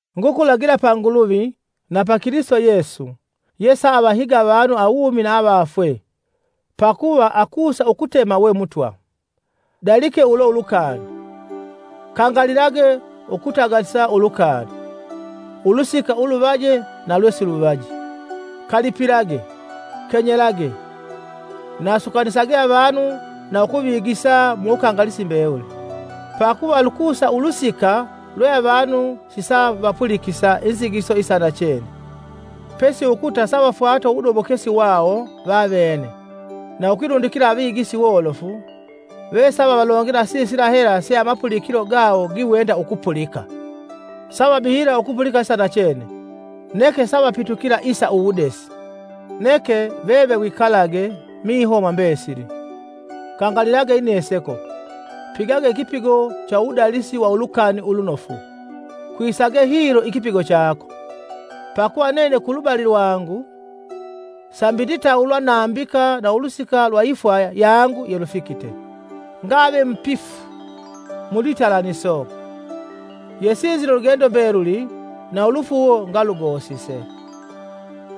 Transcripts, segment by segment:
Ngukulagila pa Nguluvi, na pa Kilisito Yesu, yesaavahiga avanu awumi na avafwe, pakuva akusa ukutema we Mutwa: dalike ulo ulukani, kangalilage ukutagalisa ulukani (ulusika ulunoje na lwesilunoji), kalipilage, kenyelage, na sukanisage avanu na ukuvigisa mu wukangalisi mbewuli. Pakuva lukusa ulusika lwe avanu sisavapulikisa inzigiso isa nachene, pesi ukuta savafwata uwudobokesi wawo vavene na ukwilundikila avigisi wolofu vesavavalongela sisila hela se amapulikilo gawo giwenda ukupulika. Savabihila ukupulika isa nachene, neke savapitukila sa uwudesi. Neke, veve wikalage, miho mwa mbesili, kangalilage ineseko, pigage ikipigo cha uwudalisi wa Ulukani Ulunofu kwisage hilo ikipigo chako. Pakuva nene kulubali lwangu, sambi nditawulwa nambika na ulusika lwa ifwa yangu yelufikite. Ngave mupifu mulwitalaniso, yesinzile ulugendo mbeluli na ulufuuwo ngalugosise.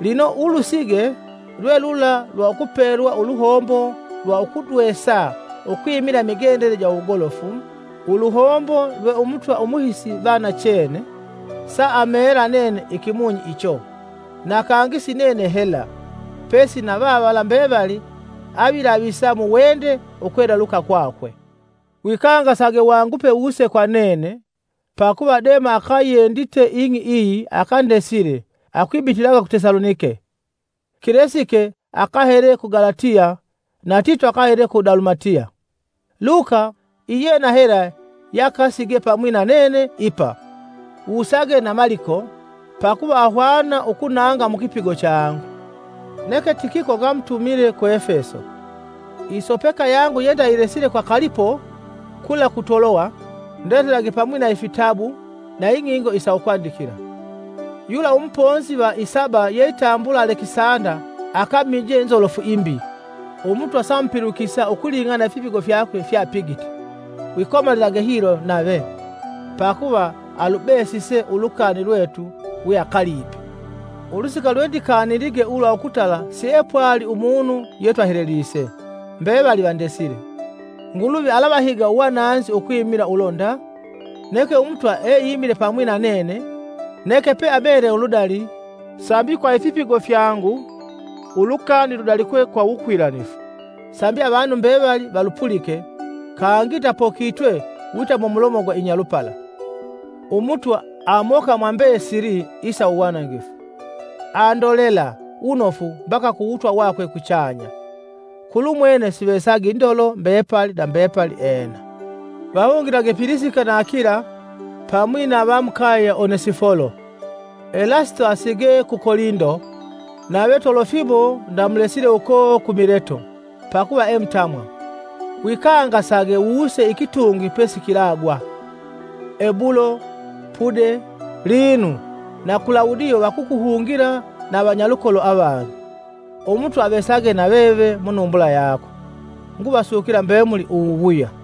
Lino ulusige lwelula lwa ukupelwa uluhombo lwa ukudwesa ukwimila imigendele ja uwugolofu, uluhombo lwe umutwa Umuhisi va nachene, saameela nene ikimunyi icho, na kangi si yinene hela, pesi na vavala mbevali avilavisa muwende ukweleluka kwakwe. Wikangasage wangupe wuse kwa nene. Pakuva Dema akayendite ing'i iyi akandesile akwibitilaga ku Tesalonike. Kilesike akahele ku Galatiya na Tito akahele ku Dalumatiya. Luka, iyena hela yeakasige pamwi na nene ipa. Wusage na Maliko, pakuva ahwana ukunanga mukipigo changu. Neke Tikiko ngamutumile ku Efeso. Isopeka yangu yendayilesile kwa Kalipo kula ku Toloya; ndetelage pamwi na ifitabu na ing'ingo isa ukwandikila. Yula umuponzi va isaba yeitambulwa Alekisanda akamije nzolofu imbi, Umutwa saamupulikisa ukuling'ana na ifipigo fyakwe fyeapigite. Wikomalilage hilo nave, pakuva alubesise ulukani lwetu weakalipe. Ulusika lwendikanilige ulwa ukutala siepwali umunu yetwahelelise, mbevali vandesile. Nguluvi alavahiga uwananzi ukwimila ulo nda! Neke Umutwa eimile pamwi na nene neke peamele uludali, sambi kwa ifipigo fyangu ulukani ludalikwe kwa wukwilanifu, sambi avanu mbevali valupulike, kangi ndapokitwe wita mumulomo gwa inyalupala. Umutwa amoka mwambesili isa uwanangifu, andolela wunofu mbaka kuwutwa wakwe kuchanya. Kulumwene sivesage indolo mbepali na mbepali! Ena. Vahungilage Pilisika na Akila, pamwi na va mukaye ya Onesifolo. Elasito asige ku Kolindo, nave Tolofimo ndamulesile uko ku Mileto, pakuva emutamwa. Wikangasage wuse ikitungwi pesikilagwa. Ebulo, Pude, Lino na Kulawudio vakukuhungila na avanyalukolo avangi. Umutwa avesage na veve munumbula yako. Nguvasukila mbemuli uwuwuya.